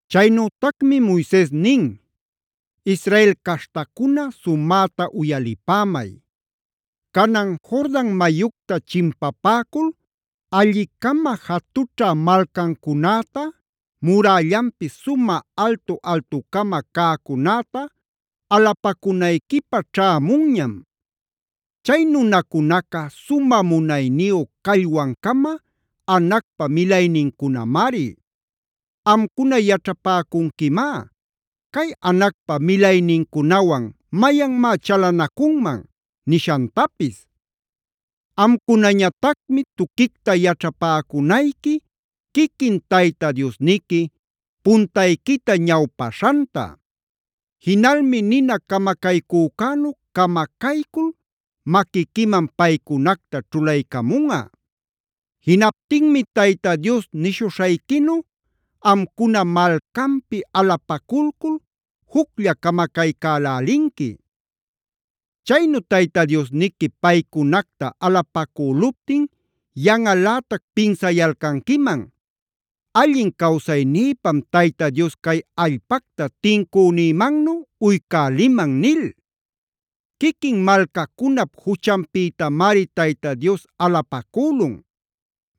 Chaynütacmi Moises nin: “Israel caśhtacuna sumäta uyalipämay. Canan Jordan mayucta chimpapäcul alli-cama jatućha malcancunäta, murällanpis sumä altu-altucama cäcunäta alupacunayquipä ćhämunñam. Chay nunacunaca sumä munayniyu callwan-cama Anacpa milaynincunamari. Amcuna yaćhapäcunquimá ‘¿Cay Anacpa milaynincunawan mayanmá chalanacunman?’ nishantapis. Amcunañatacmi tuquicta yaćhapäcunayqui quiquin Tayta Diosniqui puntayquita ñawpaśhanta. Jinalmi nina camacaycücänu camacaycul maquiquiman paycunacta ćhulaycamunꞌa. Jinaptinmi Tayta Dios nishuśhayquinu amcuna malcanpi alapaculcul juclla camacaycälälinqui. “Chaynu Tayta Diosniqui paycunacta alapacüluptin yanꞌalätac pinsayalcanquiman: ‘Allin cawsaynïpam Tayta Dios cay allpacta tincünïmannu uycäliman’ nil. Quiquin malcacunap juchanpïtamari Tayta Dios alapacülun.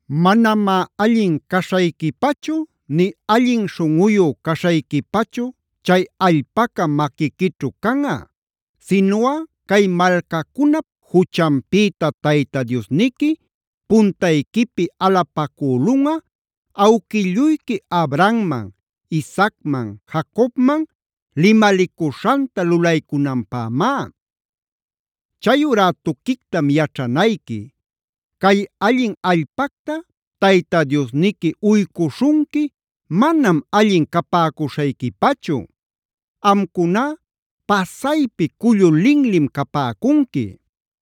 Manamá allin caśhayquipachu nï allin śhunꞌuyu caśhayquipachu chay allpaca maquiquićhu canꞌa, sinuꞌa cay malcacunap juchanpïta Tayta Diosniqui puntayquipi alapacülunꞌa, awquilluyqui Abrahamman, Isaacman, Jacobman limalicuśhanta lulaycunanpämá. Chayurá tuquictam yaćhanayqui; cay allin allpacta Tayta Diosniqui uycuśhunqui manam allin capäcuśhayquipachu. Amcuná pasaypi cullu linlim capäcunqui.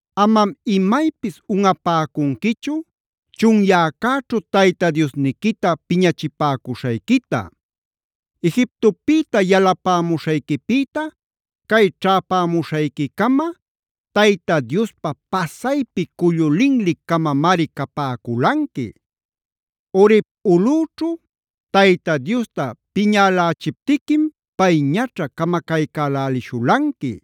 “Amam imaypis unꞌapäcunquichu chunyäcäćhu Tayta Diosniquita piñachipäcuśhayquita. Egiptopïta yalapämuśhayquipïta cay ćhäpämuśhayquicama Tayta Diospä pasaypi cullu linli-camamari capäculanqui. Horeb ulꞌüćhu Tayta Diosta piñälächiptiquim pay ñaćha camacaycälishulanqui.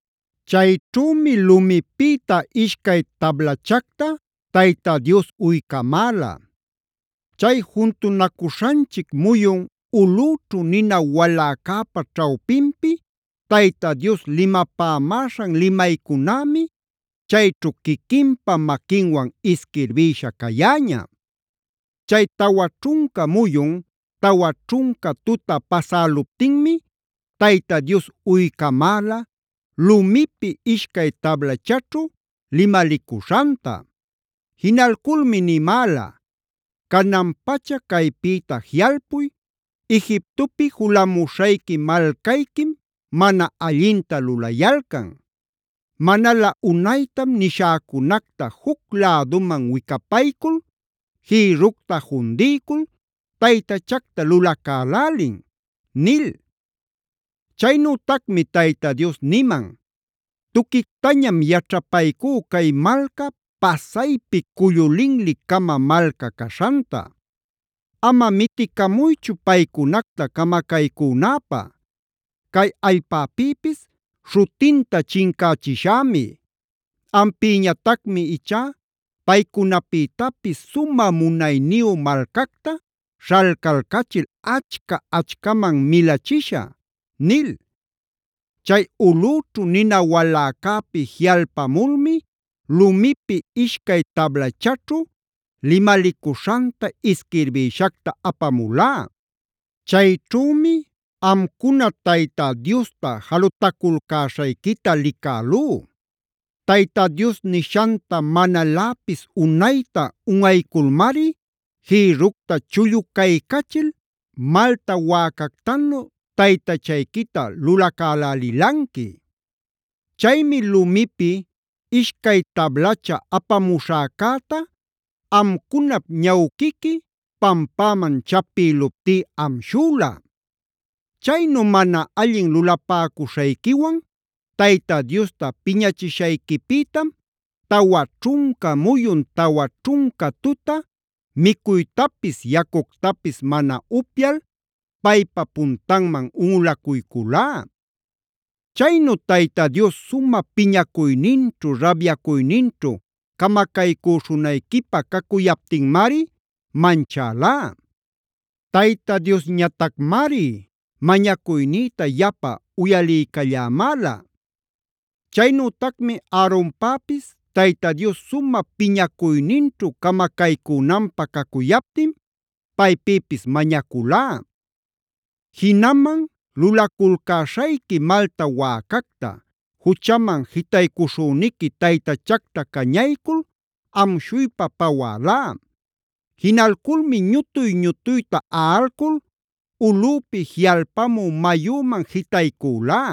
Chayćhümi lumipïta ishcay tablachacta Tayta Dios uycamäla. Chay juntunacuśhanchic muyun ulꞌüćhu nina waläcäpa ćhawpinpi Tayta Dios limapämäśhan limaycunämi chayćhu quiquinpa maquinwan isquirbïsha cayäña. Chay tawa ćhunca muyun, tawa ćhunca tuta pasäluptinmi Tayta Dios uycamäla lumipi ishcay tablachaćhu limalicuśhanta. Jinalculmi nimäla: ‘Canan-pacha caypïta jiꞌalpuy, Egiptopi julamuśhayqui malcayquim mana allinta lulayalcan. Manalä unaytam nishäcunacta juc läduman wicapaycul jïrructa jundiycul taytachacta lulacälälin’ nil. “Chaynütacmi Tayta Dios niman: ‘Tuquictañam yaćhapaycú cay malca pasaypi cullu linli-cama malca caśhanta. Ama miticamuychu paycunacta camacaycünäpä; cay allpäpïpis śhutinta chincächishämi. Ampïñatacmi ichá paycunapïtapis sumä munayniyu malcacta śhalcalcachil achca-achcaman milachishä’ nil. “Chay ulꞌüćhu nina waläcäpi jiꞌalpamulmi lumipi ishcay tablachaćhu limalicuśhanta isquirbïshacta apamulá. Chayćhümi amcuna Tayta Diosta jalutaculcäśhayquita licälú. Tayta Dios nishanta manaläpis unayta unꞌayculmari jïrructa chulluycachil malta wäcactanu taytachayquita lulacälälilanqui. Chaymi lumipi ishcay tablacha apamuśhäcäta amcunap ñawquiqui pampäman chapïluptí amshüla. Chaynu mana allin lulapäcuśhayquiwan Tayta Diosta piñachishayquipïtam tawa ćhunca muyun, tawa ćhunca tuta micuytapis yacuctapis mana upyal paypa puntanman unꞌulacuyculá. Chaynu Tayta Dios sumä piñacuyninćhu, rabyacuyninćhu camacaycüśhunayquipä cacuyaptinmari manchälá. Tayta Diosñatacmari mañacuynïta yapa uyaliycallämäla. Chaynütacmi Aaronpäpis Tayta Dios sumä piñacuyninćhu camacaycünanpä cacuyaptin paypïpis mañaculá. Jinaman lulaculcäśhayqui malta wäcacta, juchaman jitaycuśhüniqui taytachacta cañaycul amshuypa pawälá. Jinalculmi ñutuy-ñutuyta aꞌalcul ulꞌüpi jiꞌalpamu mayüman jitaycülá.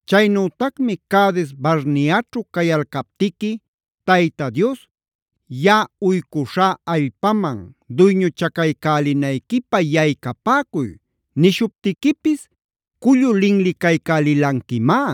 Chaynütacmi Cades-barneaćhue cayalcaptiqui Tayta Dios: ‘Yaꞌa uycuśhá allpaman duyñuchacaycälinayquipä yaycapäcuy’f nishuptiquipis cullu linlicaycälilanquimá.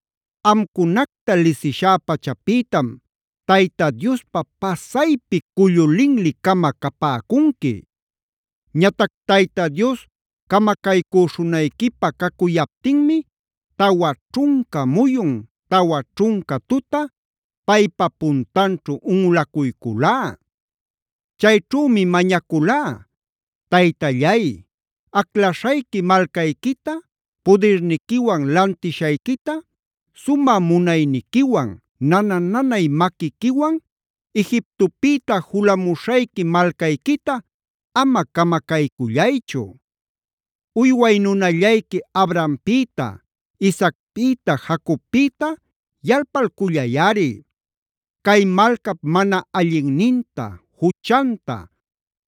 Amcunacta lisishá pachapïtam Tayta Diospä pasaypi cullu linli-cama capäcunqui. “Ñatac Tayta Dios camacaycüśhunayquipä cacuyaptinmi tawa ćhunca muyun tawa ćhunca tuta paypa puntanćhu unꞌulacuyculá. Chayćhümi mañaculá: ‘Taytallay, aclaśhayqui malcayquita, pudirniquiwan lantishayquita, sumä munayniquiwan, nana-nanay maquiquiwan Egiptopïta julamuśhayqui malcayquita ama camacaycullaychu. Uyway nunallayqui Abrahampïta, Isaacpïta, Jacobpïta yalpalcullayꞌari. Cay malcap mana allinninta, juchanta,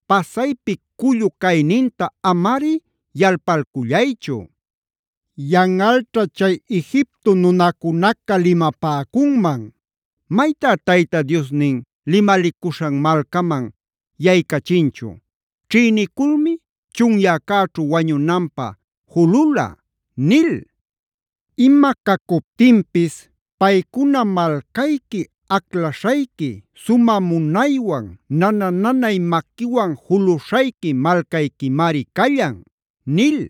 pasaypi cullu cayninta amari yalpalcullaychu. Yanꞌalćha chay julamuśhayqui malcaca limapäcunman: “Maytá Tayta Diosnin limalicuśhan malcaman yaycachinchu; ćhïniculmi chunyäcäćhu wañunanpä julula” nil. Ima cacuptinpis paycuna malcayqui, aclaśhayqui, sumä munaywan, nana-nanay maquiwan juluśhayqui malcayquimari callan’ nil.